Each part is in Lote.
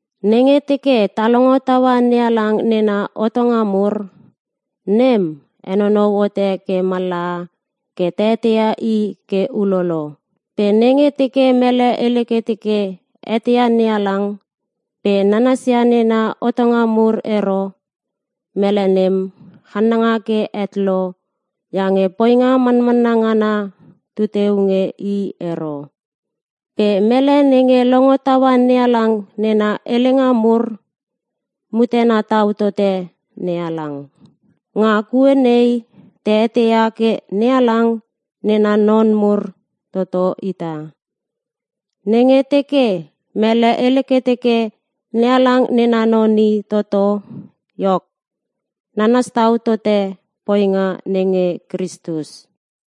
Nenge teke ta longo taua NeHalang nena hotonga mur, nem henonou hote ke mallaha nge ta eteia I ke ulolo. Pe nenge teke mele hele ke teke eteia NeHalang pe nanasia nena hotonga mur ero, mele nem channanga ke het lo iange poinga manmanna ngana tu teu nge i ero. Pe mele nenge longo taua NeHalang nena helenga mur, mutena tau tote NeHalang. Nga kue nei ta eteia ke NeHalang nena non mur toto ita: Nenge teke mele hele ke teke NeHalang nena non i toto iok, nanas tau tote poinga nenge Kristus.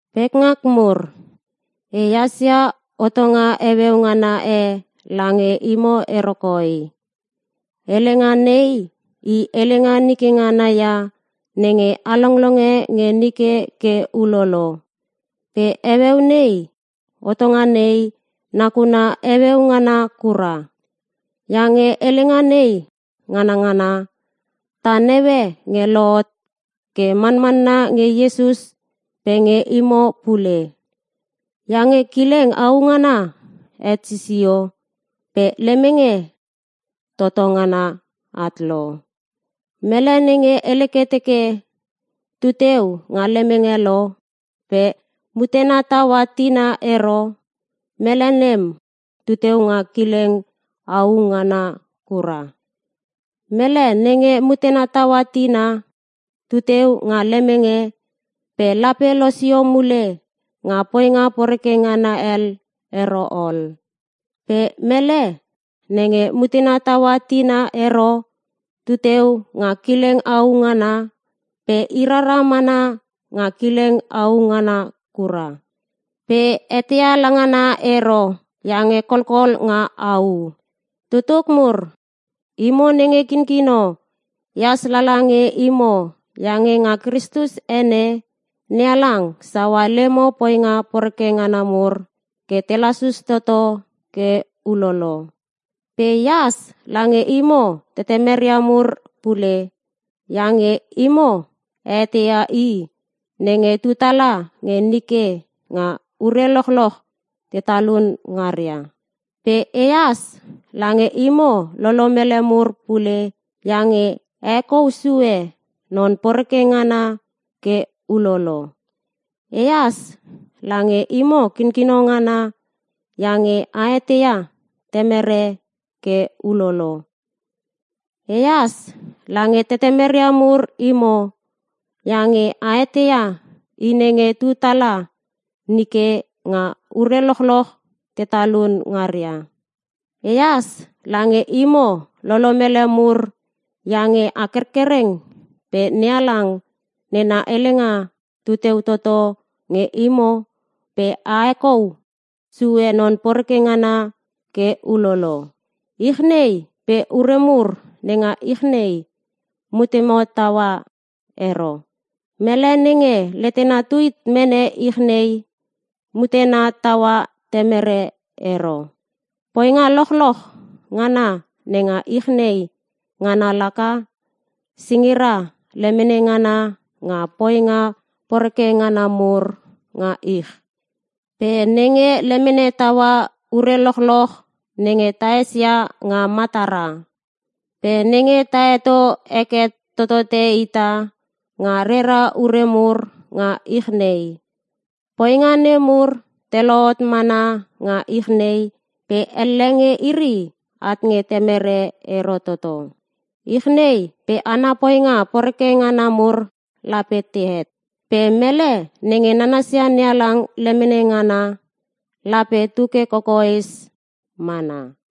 Pekngak mur, ehas ia hotonga heueu ngana e lange imo ero koi. Helenga nei, i helenga nike ngana ia nenge a longlonge nge nike ke ulolo. Pe heueu nei hotonga nei nakuna heueu ngana kura. Iange helenga nei nganangana, ta naue nge lohot ke manmanna nge Iesus pe nge imo pule. Iange kileng au ngana het sisio pe lemenge toto ngana at lo. Mele nenge hele ke teke tuteu nga lemenge lo pe mutena taua tina ero, mele nem tu teu nga kileng au ngana kura. Mele nenge mutena taua tina, tu teu nga lemenge pe lape losio mule nga poinga poreke ngana hel ero ol. Pe mele nenge mutena taua tina ero tu teu nga kileng au ngana pe i rara manmana nga kileng au ngana kura. Pe eteia langa ngana ero iange kolkol nga au. Tutuk mur, imo nenge kinkino ehas lala nge imo iange nga Kristus ene, NeHalang saua lemo poinga poreke ngana mur ke te lasus toto ke ulolo. Pe ehas lange imo tetemeria mur pule iange imo a eteia I nenge tu tala nge nike nga ure lochloch te talun ngaria. Pe ehas lange imo lolomele mur pule iange a hekou sue non poreke ngana ke ulolo. Ehas lange imo kinkino ngana iange a eteia Temere ke ulolo. Ehas lange tetemeria mur imo iange a eteia I nenge tu tala nike nga ure lochloch te talun ngaria. Ehas lange imo lolomele mur iange a kerkereng pe NeHalang nena helenga tu teu toto nge imo pe a hekou sue non poreke ngana ke ulolo. Ich nei pe ure mur nenga ich nei, mutemo taua ero. Mele nenge letena tu hit mene ich nei mutena taua Temere ero. Poinga lochloch ngana nenga ich nei ngana laka: singira lemene ngana nga poinga poreke ngana mur nga ich, pe nenge lemene taua ure lochloch nenge taesia nga matara. Pe nenge ta heto heke totote ita nga rera ure mur nga ich nei. Poinga nemur te lohot mana nga ich nei pe elle nge iri at nge Temere ero toto. Ich nei pe ana poinga poreke ngana mur lape tehet. Pe mele nenge nanasia NeHalang lemene ngana lape tuke kokoes mana.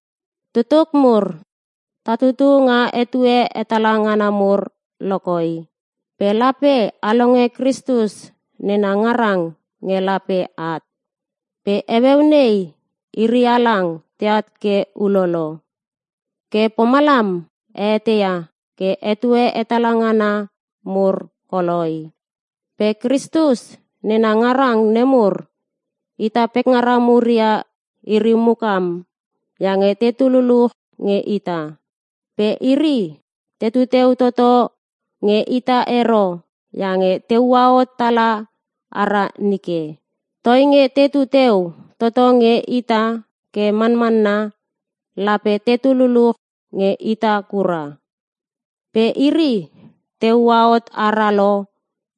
Tutuk mur, ta tutu nga etue hetala ngana mur lokoi. Pe lape a longe Kristus nena ngarang nge lape at. Pe heueu nei, iri halang teat ke ulolo. Ke pomalam a eteia ke etue hetala ngana mur koloi. Pe Kristus nena ngarang nemur ita pekngara mur ia iri mukam iange tetu luluch nge ita. Pe iri tetu teu toto nge ita ero iange te ua hot tala ara nike. Toinge tetu teu toto nge ita ke manmanna lape tetu luluch nge ita kura. Pe iri te ua hot ara lo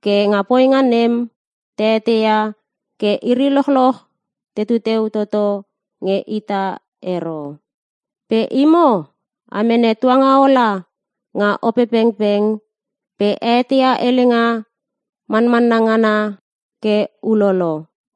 ke nga poinga nem ta eteia nge iri lochloch tetu teu toto nge ita ero. Pe imo a mene Tuangaola nga Opepengpeng pe a eteia helenga manmanna ngana ke ulolo.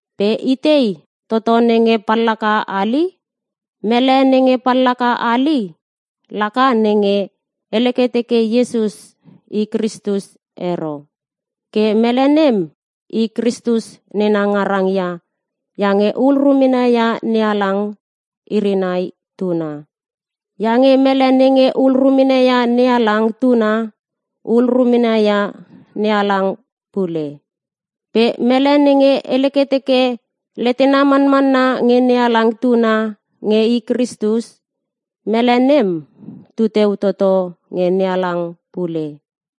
Pe itei toto nenge pallaka hali? Mele nenge pallaka hali laka nenge hele ke teke Iesus I Kristus ero. Ke mele nem i Kristus nena ngarang ia iange hul rumena ia NeHalang iri nai Tuna. Iange mele nenge hul rumena ia NeHalang Tuna, hul rumena ia NeHalang pule. Pe mele nenge hele ke teke letena manmanna nge NeHalang Tuna nge I Kristus, mele nem tu teu toto nge NeHalang pule.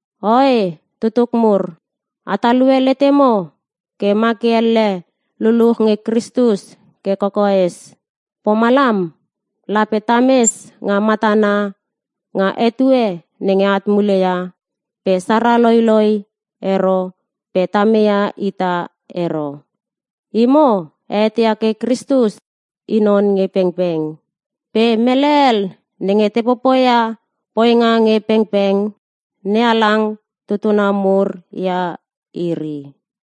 Oe tutuk mur, a talue letemo ke ma ke elle luluch nge Kristus ke kokoes. Pomalam lape tames nga matana nga etue nenge at muleia pe sara loiloi ero pe ta meia ita ero. Imo a eteia ke Kristus I non nge pengpeng. Pe mele hel nenge te popoia poinga nge pengpeng NeHalang tutuna mur ia iri.